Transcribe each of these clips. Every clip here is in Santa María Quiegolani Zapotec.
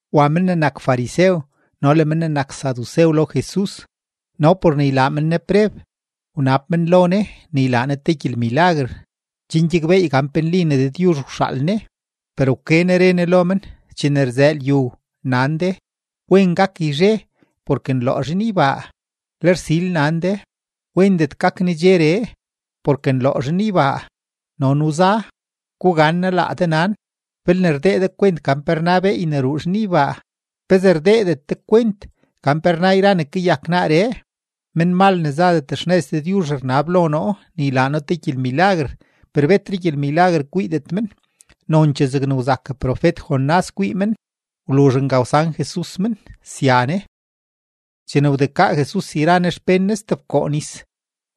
Wa men ne nak farisew no le men ne nak sadusew lo Jesus; no por ne ylaa men Ne preb, wnab men lo Ne ne ylaa Ne te gyelmilaguer chen gyakbeey gan pe nli ne Dëdyuzh wxaal Ne. Per wke Ne re Ne lo men: ―Chene rzëë lyu, nan de: “Wen gak yzhe porke nloo zhinybaa”; le rsil nan de: “Wendet gak nedxeree porke nloo zhinybaa no nuza.” ¡Gugannaa laa de nan! Belne rdee de kwent gan pe rna beey ne ruu zhinybaa, ¿pezee rdeedet de kwent gan pe rna yra ne kayak naaree? Menmal ne zadet xnëz Dëdyuzh rnab lo noo ne ylaa noo te gyelmilaguer, per betre gyelmilaguer kwiidet men, nonchee zegne wzak profet-Jonás kwii men. Wluzh nga wsan Jesus men, sya Ne. Chene wdekaa Jesus yra Ne xpén Ne stebkoo nis,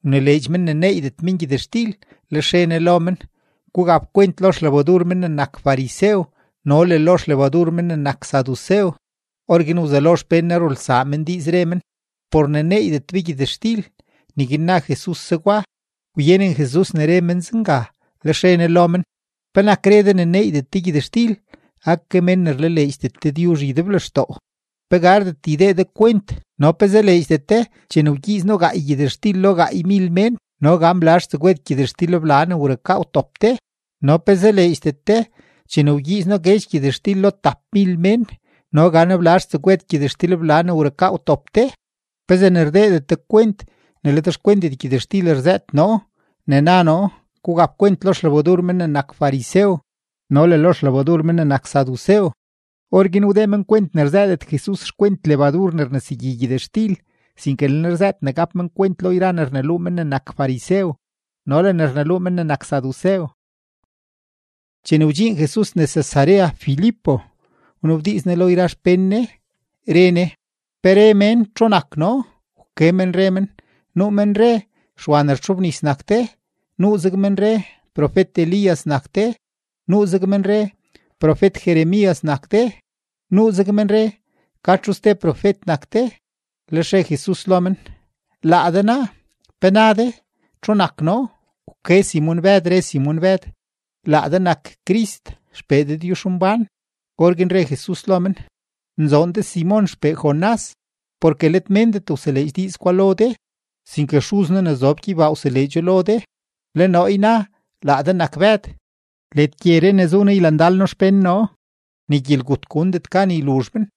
wnileedx men ne neeydet men gyëtxtil. Lex re Ne lo men: ―Gugap kwent lo xlebadur men ne nak farisew no le lo xlebadur men ne nak sadusew. Orguin wzelo xpén Ne rulsaa men diiz, re men: ―Por ne neeydet be gyëtxtil, neguin na Jesus zegwa. Wyenen Jesus ne re men zenga, lex re Ne lo men: ―¿Penak re de ne neeydet de gyëtxtil? ¡Ake mén ne rlaleedxdet Dëdyuzh ydeblextoo! ¿Pe gardet ydee de kwent no pe zaleedxdet de chene wgyiiz noo gaay gyëtxtil lo gaaymil mén no gan blazh tsegwed gyëtxtilbla ne wrukaa wtop de? No ¿pe zaleedxdet de chene wgyiiz noo guedx gyëtxtil lo tapmil mén no gan blazh tsegwed gyëtxtilbla ne wrukaa wtop de? ¿Pezee ne rdeedet de kwent ne let xkwentet gyëtxtil rzëët noo ne na noo gugap kwent lo xlebadur men ne nak farisew no le lo xlebadur men ne nak sadusew? Orguin wdee men kwent ne rzëëdet Jesus xkwent lebadur ne rnesegyi gyëtxtil, sinke le Ne rzëët ne gap men kwent lo yra ne rneluu men ne nak farisew no le ne rneluu men ne nak sadusew. Chene wdxiin Jesus nes Cesarea Filipo, wnabdiiz Ne lo yra xpén Ne, re Ne: ―¿Pe re mén txu nak noo? Wke men re men: ―Nuu men re Xwa ne rtxobnis nak de, nuuzeg men re profet-Elías nak de, nuuzeg men re profet-Jeremías nak de, nuuzeg men re ka txu ste profet nak de. Lex re Jesus lo men: ―Laa de naa, ¿pe na de txu nak noo? Wke Simon-Bëd, re Simon-Bëd: ―Laa de nak Crist XPee Dëdyuzhmbán. Orguin re Jesus lo men: ―Nzoon de Simon xpee Jonás, porke let méndet wseleedx diiz gwa lo de, sinke Xuz noo ne zob gyeybaa wseleedxo lo de. Le noo yna laa de nak Bëd. Led gyeree ne zu nee ylandal noo xpén noo, ni gyelgut gundet gan yluzh men.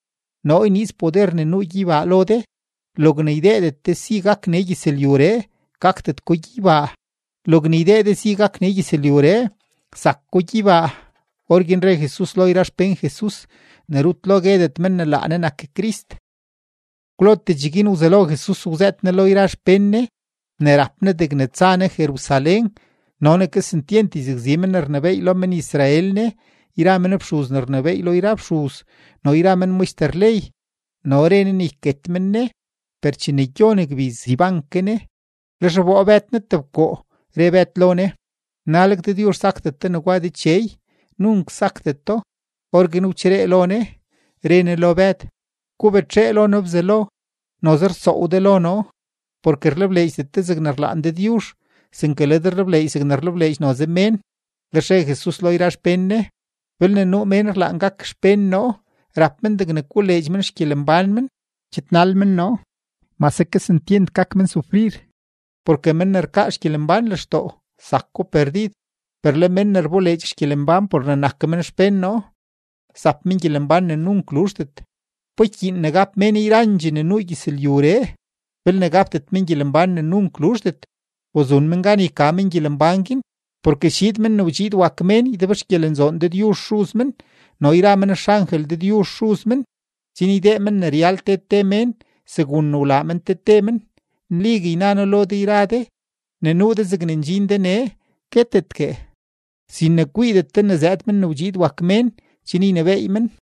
Noo yniiz poder ne nuu gyeybaa lo de; logne ydeedet de si gak nee gyëzlyuree, gakdet ko gyeybaa; logne ydee de si gak nee gyëzlyuree, zak ko gyeybaa. Orguin re Jesus lo yra xpén Jesus ne rut lo guedet men ne laa Ne nak Crist. Kwlotee cheguin wzelo Jesus wzëët Ne lo yra xpén Ne ne rap Ne degne tsa Ne Jerusalén no ne kesentyent yzakzi men ne rnebééy lo men-Israel Ne yra men fxuz ne rnebééy lo yra fxuz no yra men maxter ley. No re Ne ne yket men Ne, per chene gyon gbiz, yban ke Ne. Lex wboo Bëd Ne tebkoo, re Bëd lo Ne: ―¡Naleg Dëdyuzh sakdet de negwa Dechey! Nunk sakdeto. Orguin wcheree lo Ne, re Ne lo Bëd: ―¡Gubetxee lo noo Bzelo! Noze rsoow de lo noo, porke rlebleedxdet de zegne rlaan Dëdyuzh, sinke le de rlebleedx zegne rlebleedx noze mén. Lex re Jesus lo yra xpén Ne: ―Belne nuu mén rlaan gak xpén noo, rap men degne koleedx men xgyelembán men, chidnal men noo, mase kesentyent gak men sufrir. Porke men ne rkaa xgyelembán lextoo, zako perdid; per le men ne rboleedx xgyelembán por ne nak men xpén noo, zap men gyelembán ne nunk luzhdet. ¿Pa ykyiin ne gap mén yrandxee ne nuu gyëzlyuree belne gapdet men gyelembán ne nunk luzhdet? ¿U zun men gan yka men gyelembán guin? Porke schiid Men ne wdxiid wak Mén ydebxgyelenzoon Dëdyuzh Xuz men no yra men xangel Dëdyuzh Xuz men chen ydee men ne ryal te te mén segun ne wlaa men te te men. Nligue yna noo lo de yra de, ne nuu de zegne ndxin de nee guetetgue sin ne kwiidet de zëëd Men ne wdxiid wak Mén chen ynebééy men.